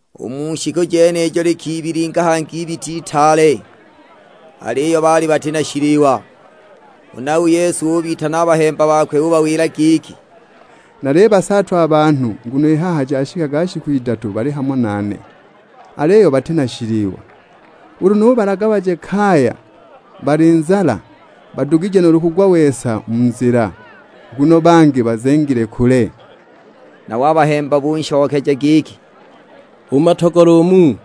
U mu shiku jenijo likibilinga hangi ibita itaale, aliyo baali bati na shiliwa. Huna u Yesu ubitana a bahemba bakwe ubawila giki, "Nalibasaatwa a banhu nguno i haha jashikaga shiku idatu bali hamo nane, aliyo bati na shiliwa. Ulu nubalaga baje kaya bali nzala, badugije nuulu kugwa-wesa mu nzila, nguno bangi bazengile kule." Nabo a bahemba bakwe bunshokeja giki, "U mu matogolo umu,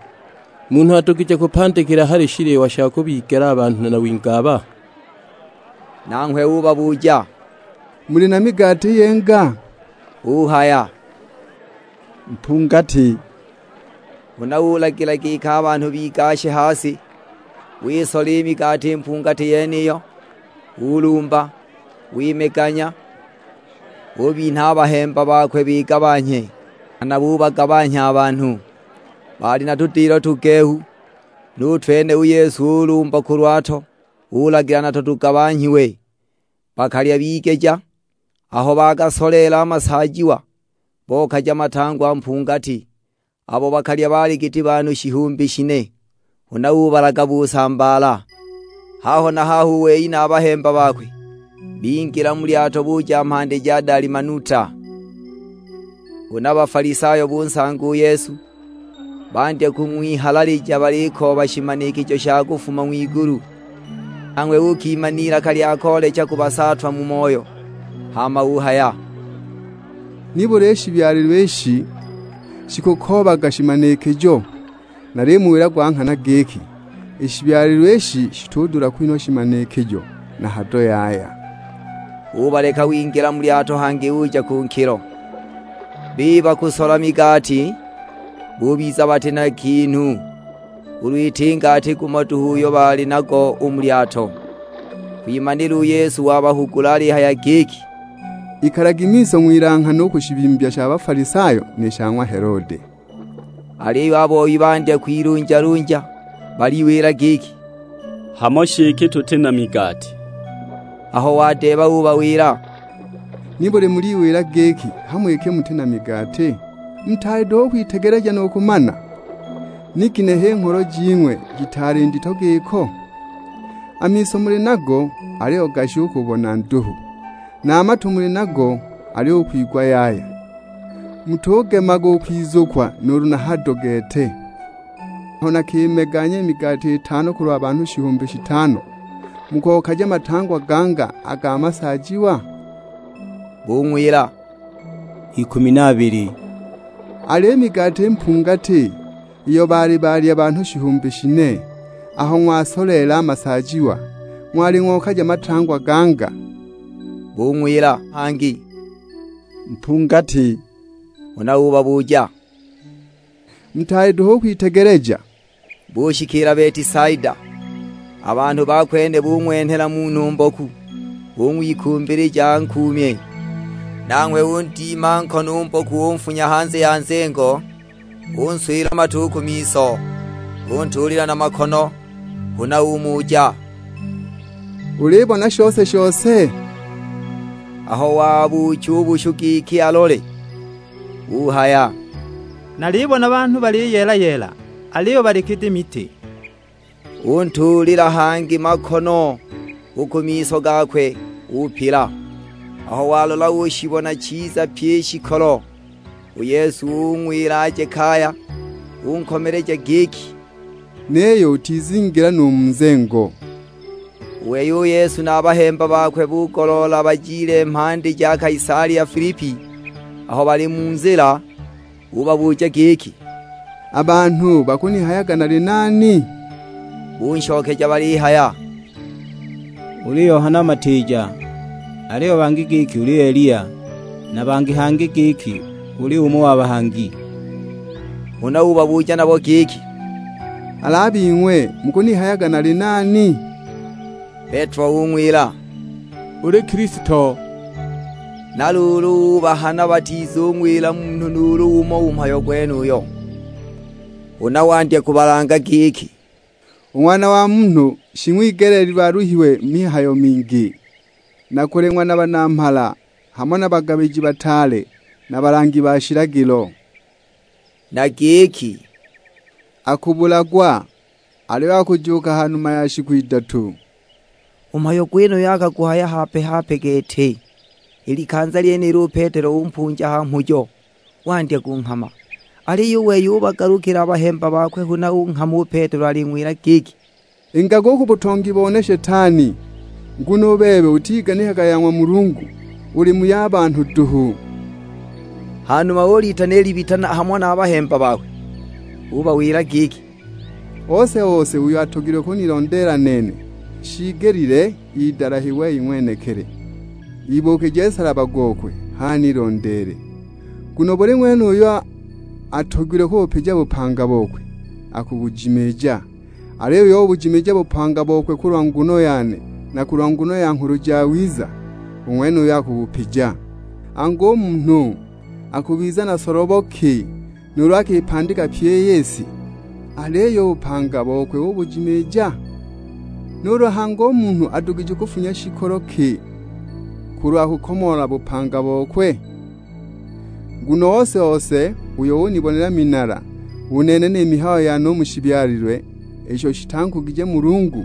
munhu adugije kupandikila hali shiliwa sha kubigela a banhu na wingi aba?" Nanghwe ubabuja, "Muli na migati yinga?" Buhaya, "Mpungati." Huna ulagila giki a banhu bigashe ha si. Wisola i migati mpungati yeniyo, ulumba, wimeganya, ubinha a bahemba bakwe bigabanhye, nghana bubagabanhya a banhu. Baali na tudilo tugehu, nu twene u Yesu ulumba kulwato, ulagila nato tugabanhyiwe. Bakalya bigeja; aho bagasoleela a masaajiwa, bokaja matangwa mpungati. Abo bakalya baali giti banhu shihumbi shine, huna ubalaga busambaala. Haho na haho u wei na a bahemba bakwe, bingila mu lyato buja mhandi ja Dalimanuta. Huna Bafalisayo bunsanga u Yesu, bandya kung'wihalalija balikooba shimanikijo sha kufuma ng'wigulu. Nanghwe ukiima n'ilaka lya koolecha kubasaatwa mu moyo; hama uhaya, "Nibuli i shibyalilwe ishi shikukoobaga shimanikijo? Nalimuwila gwa nghana giki, i shibyalilwe ishi shitudula kwinhwa shimanikijo na hado yaya." Ubaleka, wingila mu lyato hangi uja ku nkilo. Biba kusola migati, bubiza bati na ginhu, ulu iti ngati gumo duhu uyo baali nago u mu lyato. Kwimanila u Yesu wabahugula alihaya giki, "Ikalagi miso, ng'wilanghane u ku shibimbya sha Bafalisayo ni sha ng'wa Helode." Aliyo a boi bandya kwilunjalunja, baliwila giki; "Hamo shi iki tuti na migati!" Aho wadeeba ubawila, "Nibuli muliwila giki, hamo iki muti na migati? Mutaali duhu u kwitegeleja nu kumana? Ni ginehe i ngholo jing'we jitaali ndito giko? A miso muli nago, aliyo gashi u kubona nduhu! Na a matu muli nago, aliyo u kwigwa yaya! Mutugemaga u kwizukwa nuulu hado gete. Aho nakimeganya i migati iyo itano kulwa banhu shihumbi shitano, mukokaja matangwa ganga a ga masaajiwa?" Bung'wila, "Ikumi na abili." "Al'i migati mpungati, iyo baali balya banhu shihumbi shine, aho ng'wagasoleela a masaajiwa ng'wali ng'okaja matangwa ganga?" Bung'wila hangi, "Mpungati." Huna ubabuja, "Mutaali duhu u kwitegeleja?" Bushikiila Betisaida, a banhu ba kwene bung'wenhela munhu mboku, bung'wikumbilija ankuumye. Nanghwe undima nkono u mboku unfunya hanze ya nzengo. Unswila mate u ku miso, untuulila na makono; huna umuja, "Ulibona shose-shose?" Aho wabuucha u bushu giki alole, uhaya; "Nalibona banhu baliyeela-yeela, aliyo bali giti miti." Untuulila hangi makono u ku miso gakwe, upila. Aho walola ushibona chiza pyi i shikolo. U Yesu ung'wila aje kaya, unkomeleja giki, "Niyo utizingila nu mu nzengo." U wei u Yesu na a bahemba bakwe bugoloola bajile mhandi ja Kaisalia Filipi. Aho bali mu nzila, ubabuja giki, "A banhu bakunihayaga nali nani?" Bunshokeja balihaya, "Uli Yohana Matiija, aliyo bangi giki uli Eliya, na bangi hangi giki uli umo wa bahangi." Huna ubabuja nabo giki, "Al'a bing'we mukunihayaga nali nani?" Petelo ung'wila, "Uli Kilisto." Na luulu ubahana batizung'wila munhu nuulu umo u mhayo gwenuyo. Huna wandya kubalanga giki, "U Ng'wana wa Munhu shing'wigeleelilwe aluhiwe mu mihayo mingi; na kuleng'wa na banamhala, hamo na bagabiji bataale na balangi ba shilagilo." Na giki, "Akubulagwa, aliyo akujuuka ha numa ya shiku idatu." U mhayo gwenuyo akaguhaya hape-hape gete. I likanza lyenilo u Petelo umpunja ha mhujo, wandya kunghama. Aliyo u wei ubagalukila a bahemba bakwe, huna unghama u Petelo aling'wila giki, "Ingaga u ku butongi bone Shetani. Nguno u bebe utiganikaga ya ng'wa Mulungu, uli mu ya banhu duhu!" Ha numa ulitana i libita hamo na a bahemba bakwe; ubawila giki, "Ose-ose uyo atogilwe kunilondeela nene, shiigelile idalahe wei ng'wenekili, ibuukije nsalaba gokwe, h'anilondeele. Nguno buli ng'wene uyo atogilwe kubupija bupanga bokwe, akubujimiija, aliyo uyo ubujimiija u bupanga bokwe kulwa nguno yane na kulwa nguno ya Nghulu Jawiza, u ng'wenuyo akubupija. Angu, u munhu akubiza na solobo ki nuulu akipandika pyi i si, aliyo u bupanga bokwe ubujimiija? Nuulu hangi u munhu adugije kufunya shikolo ki kulwa kukomoola bupanga bokwe? Nguno ose-ose uyo unibonela minala u nene ni mihayo yane u mu shibyalilwe isho shitankugije Mulungu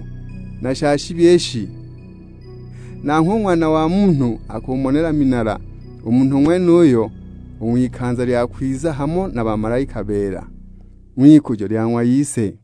na sha shibi ishi, nanghwe u Ng'wana wa Munhu akumonela minala u munhu ng'wenuyo, u ng'wikanza lya kwiza hamo na bamalaika beela, ng'wikujo lya ng'wa Ise."